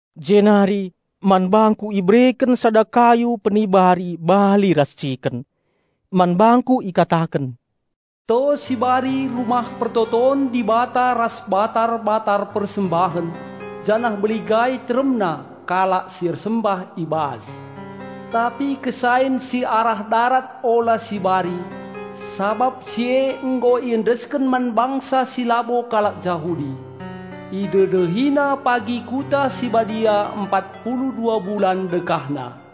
Jenari man bangku ibereken sada kayu penibari bali ras ciken. Man bangku ikataken, "To sibari Rumah Pertoton Dibata ras batar-batar persembahen, janah beligai teremna kalak si ersembah i bas. Tapi kesain si arah darat ula sibari, sabap si e nggo iendesken man bangsa si labo kalak Jahudi. Idedehina pagi Kota si Badia empat pulu dua bulan dekahna.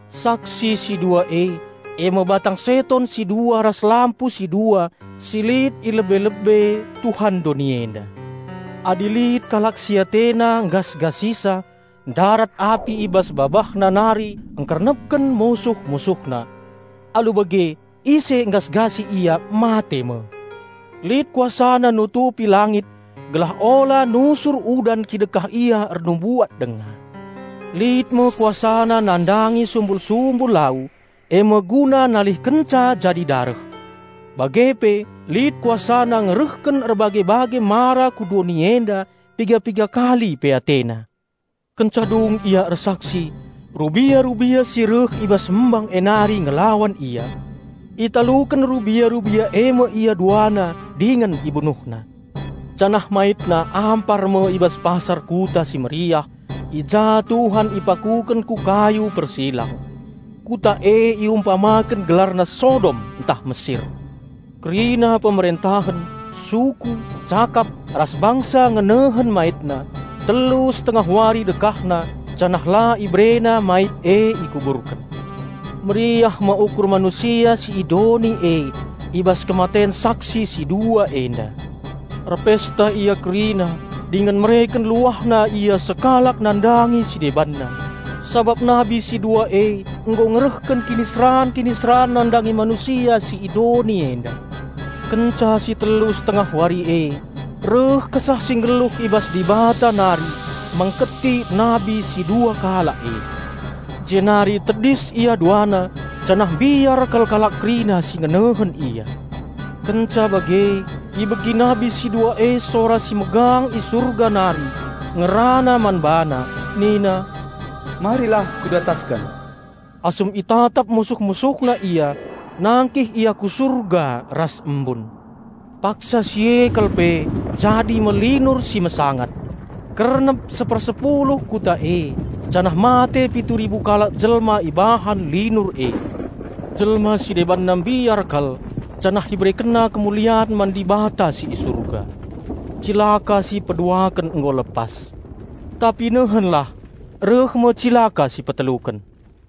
Saksi si dua e, e me batang seton si dua ras lampu si dua si lit i lebe-lebe Tuhan doni enda. Adi lit kalak si atena nggasgasisa ndarat api i bas babahna nari ngkernepken musuh-musuhna. Alu bage ise nggasgasi ia mate me. Lit kuasana nutupi langit gelah ula nusur udan kidekah ia ernubuat denga. Lit me kuasana nandangi sumbul-sumbul lau, e me guna nalihkenca jadi dareh. Bage pe lit kuasana ngerehken erbage-bage mara ku doni enda piga-piga kali pe atena. Kenca dung ia ersaksi, rubia-rubia si reh i bas embang e nari ngelawan ia. Italuken rubia-rubia e me ia duana dingen ibunuhna, janah maitna ampar me i bas pasar kuta si meriah, i ja Tuhan ipakuken ku kayu persilang. Kuta e iumpamaken gelarna Sodom ntah Mesir. Kerina pemerentahen, suku, cakap, ras bangsa ngenehen maitna telu setengah wari dekahna janah la iberena mait e ikuburken. Meriah me ukur manusia si i doni e i bas kematen saksi si dua enda. Erpesta ia kerina dingen mereken luahna ia sekalak nandangi si debanna, sabap nabi si dua e nggo ngerehken kiniseran-kiniseran nandangi manusia si i doni enda. Kenca si telu setengah wari e, reh kesah si nggeluh i bas Dibata nari, mengketi nabi si dua kalak e. Jenari tedis ia duana, janah mbiar kal kalak kerina si ngenehen ia. Kenca bage ibegi nabi si dua e sora si megang i Surga nari, ngerana man bana nina, "Marilah ku datasken!" Asum itatap musuh-musuhna ia, nangkih ia ku Surga, ras embun. Paksa si e kal pe jadi me linur si mesangat. Kernep sepersepuluh kuta e, janah mate pitu ribu kalak jelma ibahan linur e. Jelma si debanna mbiar kal janah iberekenna kemulian man Dibata si i Surga. Cilaka si peduaken nggo lepas. Tapi nehenlah! Reh me cilaka si peteluken.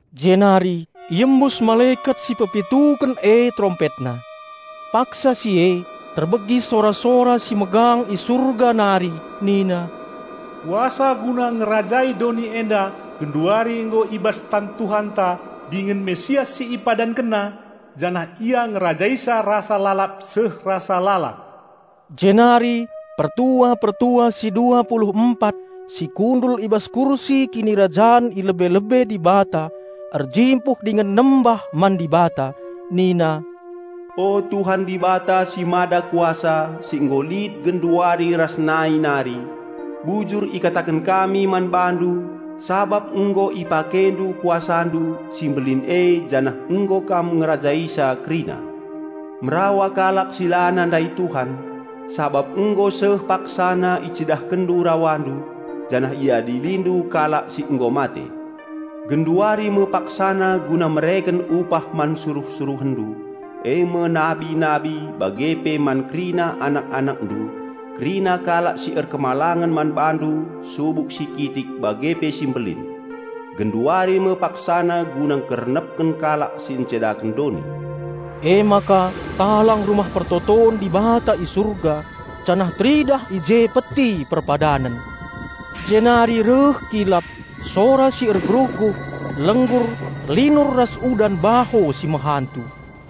Jenari iembus malekat si pepituken e terompetna. Paksa si e terbegi sora-sora si megang i surga nari nina, "Kuasa guna ngerajai doni enda genduari nggo i bas tan Tuhanta dingen Raja Penampat si IpadankenNa janah Ia ngerajaisa rasa lalap seh rasa lalap." Jenari pertua-pertua si dua pulu empat si kundul i bas kursi kinirajan i lebe-lebe Dibata erjimpuh dingen nembah man Dibata, nina, "O Tuhan Dibata si Mada Kuasa si nggo lit genduari ras nai nari. Bujur ikataken kami man bandu sabap nggo IpakeNdu KuasaNdu, si mbelin e, janah nggo Kam ngerajaisa kerina. Merawa kalak si la nandai Tuhan, sabap nggo seh paksana IcidahkenNdu RawaNdu, janah IadiliNdu kalak si nggo mate. Genduari me paksana guna mereken upah man suruh-SuruhenNdu, e me nabi-nabi bage pe man kerina anak-AnakNdu, kerina kalak si erkemalangen man BaNdu subuk si kitik bage pe si mbelin. Genduari me paksana guna ngkernepken kalak si ncedaken doni." Emaka talang Rumah Pertoton Dibata i Surga, janah teridah i je Peti Perpadanen. Jenari reh kilap, sora si ergeruhguh, lenggur, linur ras udan baho si mehantu.